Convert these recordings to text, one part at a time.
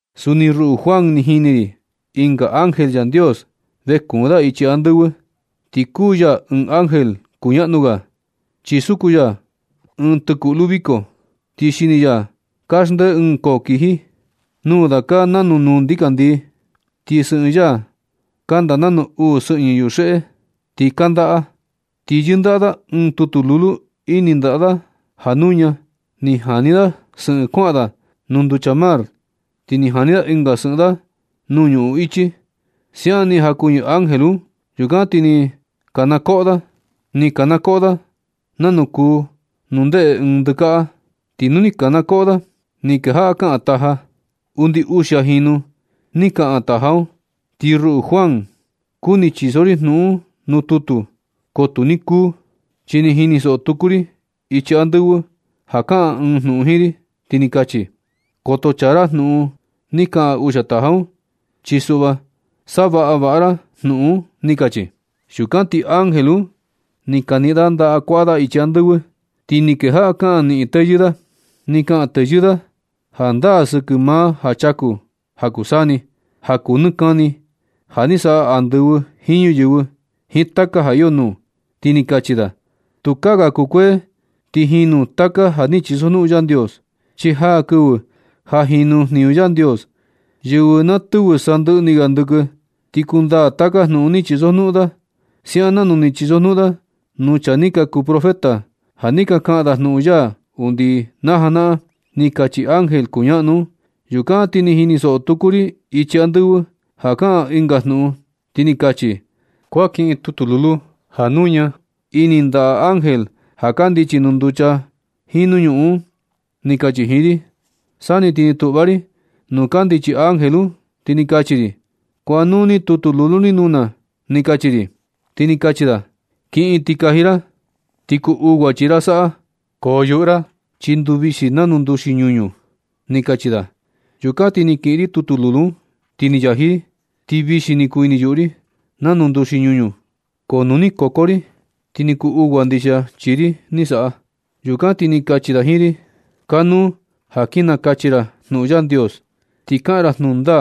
Suni ruꞌu Juan, ni jini ri ɨnga ángel Yandios vee kuun da ichi andɨvɨ. Ti kuu ya ɨɨn ángel kuñaꞌnu ga. Chi suku ya ɨɨn tɨkuꞌlu viko, ti xini ya kaxndee ɨɨn koo kiji. Nuu da kaa nanu nuu ndikandii. Ti sɨꞌɨn ya kanda nanu uu sɨꞌñɨ yuxeꞌe, ti kandaꞌa. Ti yɨndaꞌa da ɨɨn tutu lulu ini ndaꞌa da ja nuña. Ni jani da sɨꞌɨn kuaꞌa da nuu nducha mar ti ni jani da ɨnga sɨꞌɨn da nuu ñuꞌun ichi. Siaꞌan ni jakuɨñɨ ángel un. Yukan ti ni kanakoꞌo da. Ni kanakoꞌo da nanu kuu nu ndeꞌe ɨɨn ndɨkaꞌa. Ti nu ni kanakoꞌo da, ni kejaꞌa kaꞌan taja. Undi uxia jinu ni kaꞌan taja un. Ti ruꞌu Juan, kuni chiso ri jnuꞌun un nuu tutu, ko tu ni kuu, chi ni jinisoꞌo tuku ri ichi andɨvɨ ja kaꞌan ɨɨn jnuꞌun jiin ri, ti ni kachi: ―Koto chaa ra jnuꞌun ni kaꞌan uxia taja un. Chi suꞌva savaꞌa vaꞌa ra jnuꞌun un ―ni kachi. Yukan ti ángel un ni kaniꞌin da ndaꞌa kuaꞌa da ichi andɨvɨ, ti ni kejaꞌa kaꞌan niꞌin teyɨɨ da. Ni kaꞌan teyɨɨ da jandaa sɨkɨ maa ja chaku ja kuu saa ni, ja kuu nɨ kani, ja ni saꞌa andɨvɨ jiin ñuyɨvɨ jiin taka ja iyo nuu, ti ni kachi da: ―Tukaa ga kukuee ti jinu taka ja ni chisojnuꞌun Yandios. Chi jaa kɨvɨ ja jinu jniñu Yandios. Yɨvɨ na tɨvɨ sandɨꞌɨ ni ga ndɨkɨ, ti kundaa taka jnuꞌun ni chisojnuꞌun da. Siaꞌan nanu ni chisojnuꞌun da nuu chaa ni ka kuu profeta, ja ni ka kaꞌan da jnuꞌun ya undi najanaꞌan ―ni kachi ángel kuñaꞌnu un. Yukan ti ni jinisoꞌo tuku ri ichi andɨvɨ ja kaꞌan ɨnga jnuꞌun, ti ni kachi: ―Kuan kiꞌin tutu lulu ja nuña ini ndaꞌa ángel ja kandichi nuu nducha jiin nuu ñuꞌun un ―ni kachi jiin ri. Sa ni ti ni tuꞌva ri nuu kandichi ángel un, ti ni kachi ri: ―Kuaꞌa nuu ni tutu lulu ni nuu na ―ni kachi ri. Ti ni kachi da: ―Kiꞌin ti kaji ra. Ti kuu ugua chii ra saꞌa. Ko yuꞌu ra, chi nduu vixi nanu nduxi ñuñu ―ni kachi da. Yukan ti ni kiꞌin ri tutu lulu un, ti ni yaji ri. Ti vixi ni kuu ini yuꞌu ri nanu nduxi ñuñu. Ko nu ni koko ri ti ni kuu ugua ndixia chii ri ni saꞌa. Yukan ti ni kachi da jiin ri: ―Kanuu ja kin nakachi ra jnuꞌun Yandios. Ti kaꞌan ra jnuꞌun da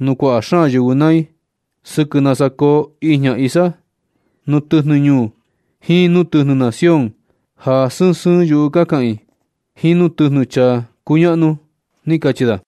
nuu kuaꞌa xaan yɨvɨ naa i sɨkɨ nasa koo ijña isa, nuu tɨjnɨ ñuu jiin nuu tɨjnɨ nación ja sɨɨn sɨɨn yuꞌu ka kaꞌan i, jiin nuu tɨjnɨ chaa kuñaꞌnu ―ni kachi da.